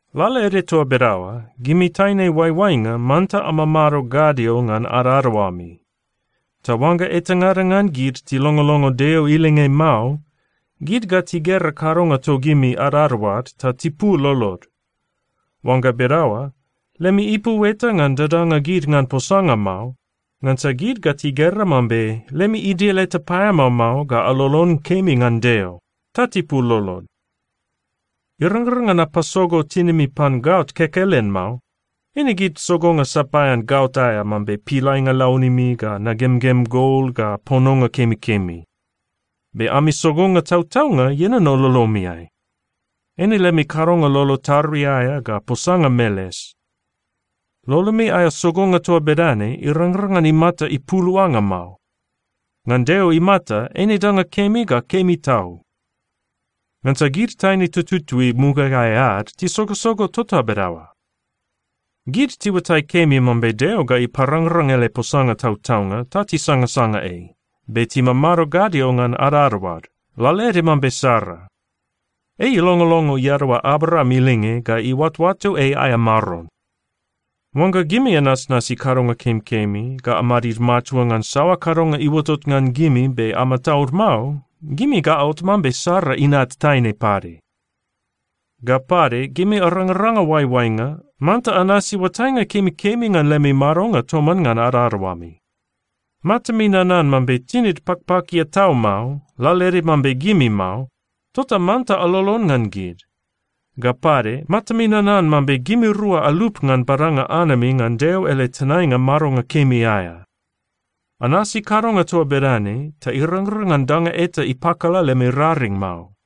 Lalaede toa bedaoa, gimi taine oaioainga manta amamado gadio ngan adadaoami. Ta oangga etangada ngan gid tilongolongo Deo ilinge mao, gid ga tigera kadonga togimi adadaoad ta tipul lolod. Oangga bedaoa, lemi ipu eta ngan dadanga gid ngan posanga mao, ngansa gid ga tigera mambe lemi idil eta paeamao mao ga alolon kemi ngan Deo, ta tipul lolod. Irangrang ngan apasogo tinimi pan gaot kekelen mao. Eine gid sogonga sapaean gaot aea mambe pilainga launimi ga nagemgem gol ga pononga kemikemi. Be ami sogonga tautaunga ienono lolomiai. Eine lemi kadonga lolo tarui aea ga posanga meles. Lolomi aea sogonga toa bedane irangrang ngan imata ipuluanga mao. Ngan Deo imata, eine danga kemi ga kemi tau. Ngansa gid taine tututui mugaeai ad tisogosogo tota bedaoa. Gid tiuatai kemi mambe Deo ga iparangrang ele posanga tautaunga ta tisangasanga ei, be timamado gadio ngan adadaoad, lalaede mambe Sara. Ei ilongolongo iadaoa Abraam ilinge ga iuatoato ei aea maron. Oangga gimi anasnasi kadonga kemikemi, ga amadid matua ngan saoa kadonga iuotot ngan gimi be amataud mao, gimi ga aot mambe Sara inat taine pade. Ga pade, gimi arangaranga oaioainga, manta anasi oatainga kemikemi ngan lemi madonga toman ngan adadaoami. Matami nanan mambe tinid pakpakia tau mao, lalaede mambe gimi mao, tota manta alolon ngan gid. Ga pade matami nanan mambe gimirua alup ngan badanga anami ngan Deo ele tenainga madonga kemi aea. Anasi kadonga toa bedane ta irangrang ngan danga eta ipakala lemi raring mao.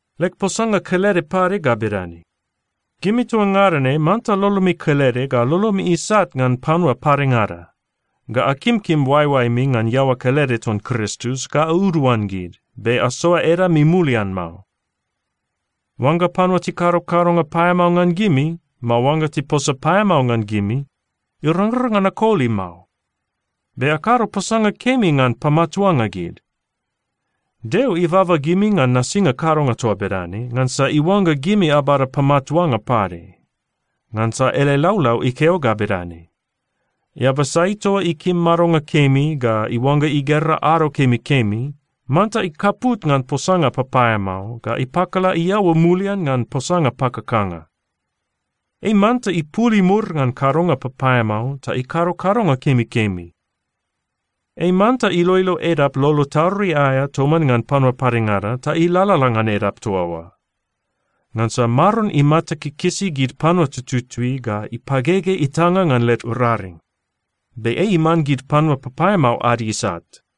Leg posanga kelede pade ga bedane: Gimi toa ngada ne manta lolomi kelede, ga lolomi isat ngan panua padengada, ga akimkim oaeoaemi ngan iaoa kelede ton Kristus, ga auduan gid, be asoa edami mulian mao. Oangga panua tikado kadonga paeamao ngan gimi, mao oangga tiposa paeamao ngan gimi, irangrang ngan akoli mao. Be akado posanga kemi ngan pamatuanga gid. Deo ibaba gimi ngan nasinga kadonga toa bedane, ngansa iuangga gimi abada pamatuanga pade. Ngansa ele laulau ikeo ga bedane, “Eaba sai toa ikim madonga kemi ga iuangga igera ado kemikemi, manta ikaput ngan posanga papaeamao ga ipakala iaoa mulian ngan posanga pakakanga. Ei manta ipul imur ngan kadonga papaeamao ta ikado kadonga kemikemi. Ei manta iloilo edap lolo tarui aea toman ngan panua padengada ta ilalala ngan edap toa oa. Ngansa Maron imata kikisi gid panua tututui ga ipagege itanga ngan led raring. Be ei iman gid panua papaeamao ad isat.”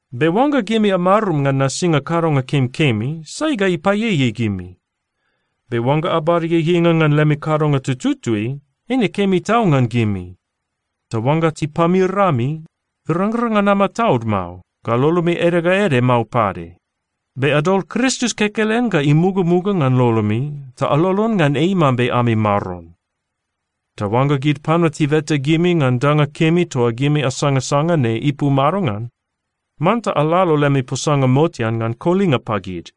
Be oangga gimi amarum ngan nasinga kadonga kemikemi, sai ga ipaieiei gimi? Be oangga abada ieieinga ngan lemi kadonga tututui, eine kemi tau ngan gimi. Ta oangga tipamir ami, irangrang ngan amataud mao, ga lolomi ede ga ede mao pade. Be adol Kristus kekelen ga imugamuga ngan lolomi ta alolon ngan ei mambe ami Maron. Ta oangga gid panua tibeta gimi ngan danga kemi toa gimi asangasanga ne ipu madongan, manta alalo lemi posanga motean ngan kolinga pagid.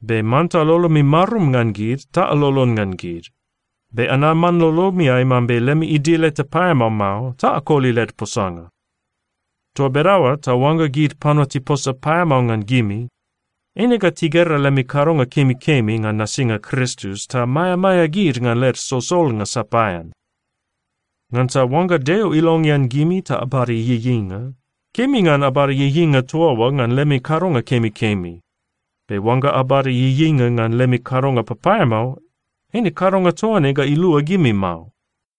Be manta lolomi marum ngan gid ta alolon ngan gid. Be anaman lolomiai mambe lemi idil eta paeamao mao ta akoli led posanga. Toa bedaoa ta oangga gid panua tiposa paeamao ngan gimi, eine ga tigera lemi kadonga kemikemi ngan nasinga Kristus, ta maeamaea gid ngan led solsolnga sapaean. Ngansa oangga Deo ilongean gimi ta abada ieieinga, kemi ngan abada ieieinga toa oa ngan lemi kadonga kemikemi. Be oangga abada ieieinga ngan lemi kadonga papaeamao, eine kadonga toa ne ga ilua gimi mao.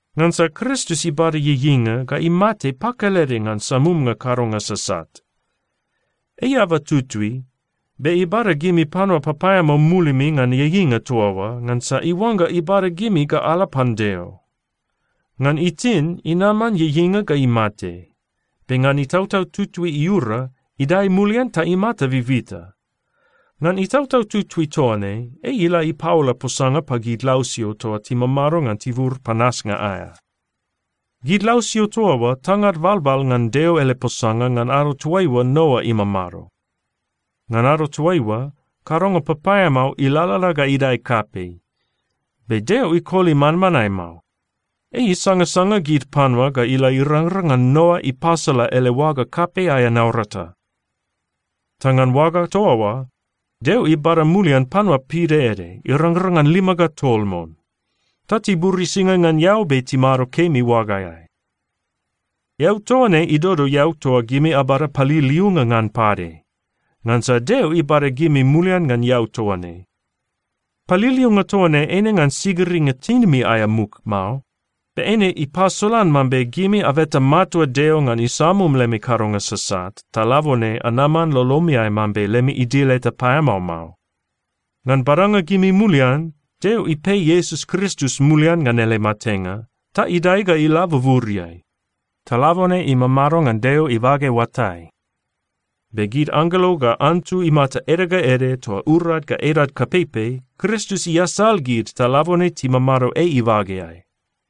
Ngansa Kristus ibada ieieinga ga imate pakelede ngan samumnga kadonga sasat. Ei eaba tutui, be ibada gimi panua papaeamao mulimi ngan ieieinga toa oa, ngansa iuangga ibada gimi ga ala pan Deo. Ngan itin, inaman ieieinga ga imate, be ngan Itautau Tutui iura, idae mulian ta imata bibita. Ngan Itautau Tutui toa ne, ei ila ipaola posanga pagid lausio toa timamado ngan tibur panasnga aea. Gid lausio toa oa tangad balbal ngan Deo ele posanga ngan ado toaiua Noa imamado. Ngan ado toaiua, kadonga papaeamao ilalala ga idae kapei, be Deo ikoli manmanae mao. Ei isangasanga gid panua ga ila irangrang ngan Noa ipasala ele oaga kapei aea naurata. Ta ngan oaga toa oa, Deo ibada mulian panua pidaede, irangrang ngan lima ga tol mon. Ta tiburisinga ngan eau be timado kemi oagaeai. Eau toa ne idodo eau toa gimi abada paliliunga ngan pade, ngansa Deo ibada gimi mulian ngan eau toa ne. Paliliunga toa ne eine ngan sigiringa tinimi aea muk mao. Be eine ipasolan mambe gimi abeta matua Deo ngan isamum lemi kadonga sasat, ta labone anaman lolomiai mambe lemi idil eta paeamao mao. Ngan badanga gimi mulian, Deo ipei Iesus Kristus mulian ngan ele matenga, ta idae ga ila buburiai. Ta labone imamado ngan Deo ibage oatai. Be gid anggelo ga antu imata ede ga ede toa urad ga edad kapeipei, Kristus iasal gid ta labone timamado ei ibageai.